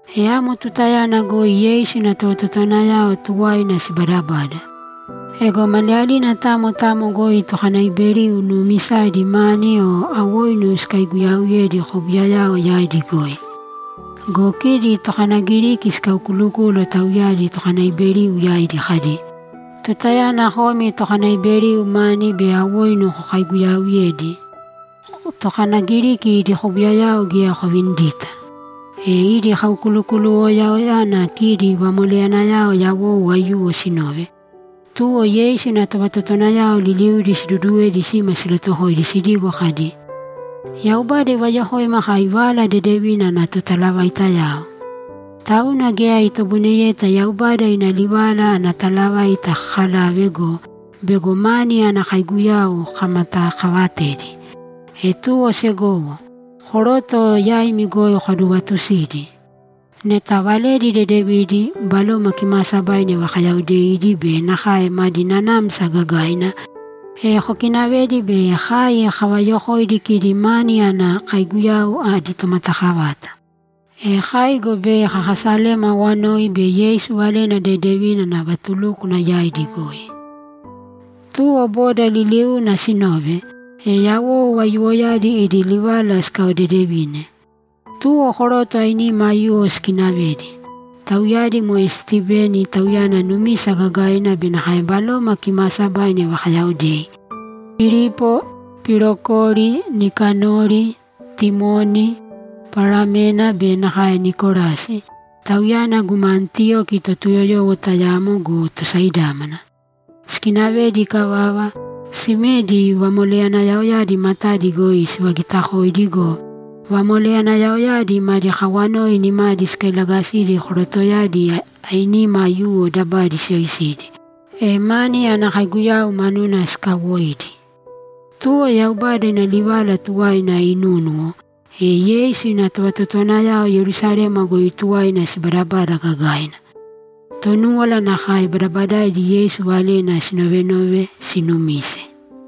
E amo tutayana goi Yeisu ina tovatotowanayao tuwaina sibadabada. Ego maliyalina tamo tamo goi tokanaiberiu nuumisaidi mani o awoinu sikaiguyauyedi kobuyayao yaidi goi. Go kidi tokanagiriki sikaukulukúluwo tauyadi tokanaiberiu yaidi kadi, ‘Tutayana komi tokanaiberiu mani be awoinu kokaiguyauyedi, tokanagiriki idi kobuyayao geya kovinidita!’ E idi kaukulukuluwoyana kidi vamoleyanayao yawou aiyuwo sinove, tuwo Yeisu ina tovatotowanayao liliudi siduduwedi sima silatuwokoidi sidigo kadi, ‘Yaubada ivayokoima kai Vala Dedevina ana totalavaitayao. Tauna geya itoboineyeta Yaubada ina livala ana talavaita kakalave go, bego mani ana kaiguyau kamatakavatedi. E tuwo segowo, koroto yaimi goi kodovatusīdi. Neta valedi dedevidi, Baloma Kimaasabaina ivakayaodeidi be nakae madi nanamsa gagaina, e kokinavēdi bei kai kavayokoidi kidi mani ana kaiguyau adi tomatakavata. E kai go bei kakasalema awanoi be Yeisu Valena Dedevina ana vatulúkwana yaidi goi.’ Tuwo boda liliuuna sinove, e yawou aiyuwoyadi idi livala sikaodedevine. Tuwo koroto ainima aiyuwo sikinavedi. Tauyadi moe Stiveni, tauyana numisa gagaina be nakae Baloma Kimaasabaina ivakayaodei, Pilipo, Pirokori, Nikanori, Timoni, Paramena be nakae Nikolasi, tauyana guma Antiyoki Totuyoyowo tayamo go, tosaidámana. Sikinavedi ikavava, simedi vamoleyanayaoyadi matadi goi sivagitakoidi go, vamoleyanayaoyadi madi kawanoi nimadi sikailagasidi korotoyadi ainima aiyuwo dabadi siyoisidi, e mani ana kaiguyau manuna sikawoidi. Tuwo Yaubada ina livala tuwaina inunúnuwo, e Yeisu ina tovatotowanayao Yerusalema goi tuwaina sibaadabada gagaina. Tonúwala nakae; badabadaaidi Yeisu valena sinovenove, siinumise.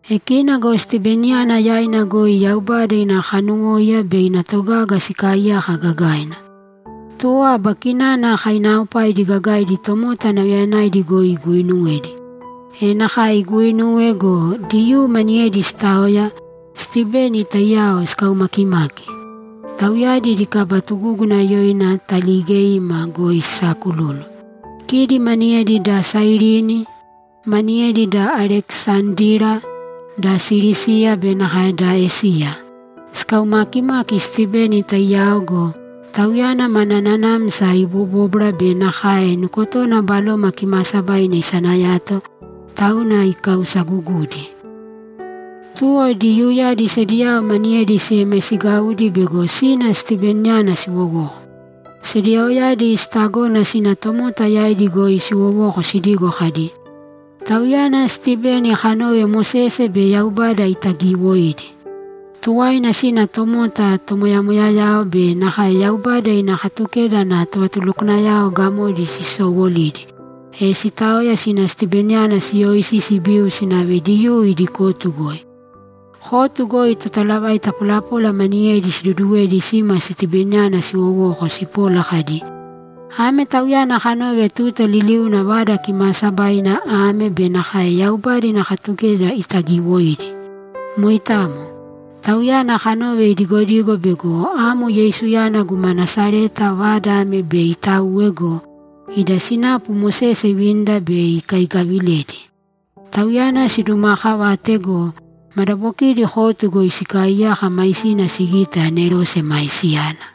E kina go Stiveniyana yaina goi Yaubada ina kanuwóiya be ina togaga sikaaiyaka gagaina. Tuwo aba kinana kainaaopaidi gagaidi tomota nauyayanaidi goi iguuinuwedi. E nakae iguuinuwe go, Diyuu maniyedi sitaoya, Stiveni taiyao sikaumakimaki. Tauyadi idi kaba tugúguna yoina Taaligeima goi sisaakululu. Kidi maniyedi da Sairini, maniyedi da Alekisandira, da Silisiya be nakae da Esiya. Sikaumaakimaki Stiveni taiyao go, tauyana mana nanamsa ibobóbwara be nakae nukotona Baloma Kimaasabaina isanayato, tauna ikausagugudi. Tuwo Diyuuyadi sediyao maniyedi siemaisigaudi bego sina Stiveniyana siwowoko. Sediyaoyadi sitagona sina tomota yaidi goi siwowoko sidigo kadi, ‘Tauyana Stiveni kanove Mosese be Yaubada itagiiwoidi.’ Tuwaina sina tomota, tomoyamoyayao be nakae Yaubada ina Katukeda ana tovatulukwanayao gamodi sisowolidi, e sitaoya sina Stiveniyana siyoisi sibiu sinave Diyuu idi kotu goi. Kotu goi totalavaita polapola maniyedi siduduwedi sima Stiveniyana siwowoko sipola kadi, ‘Ame tauyana kanove tuta liliuna Vada Kimaasabaina ame be nakae Yaubada ina Katukeda itagiiwoidi. Moitamo. Tauyana kanove idigodigo bego amo Yeisuyana guma Nasareta vada ame bei itauwe go, ida sinapu Mosese ivinida bei ikaigaviledi.’ Tauyana sidumaakavate go, madabokidi kotu goi sikaaiyaka maisina sigite anerose maisiyana.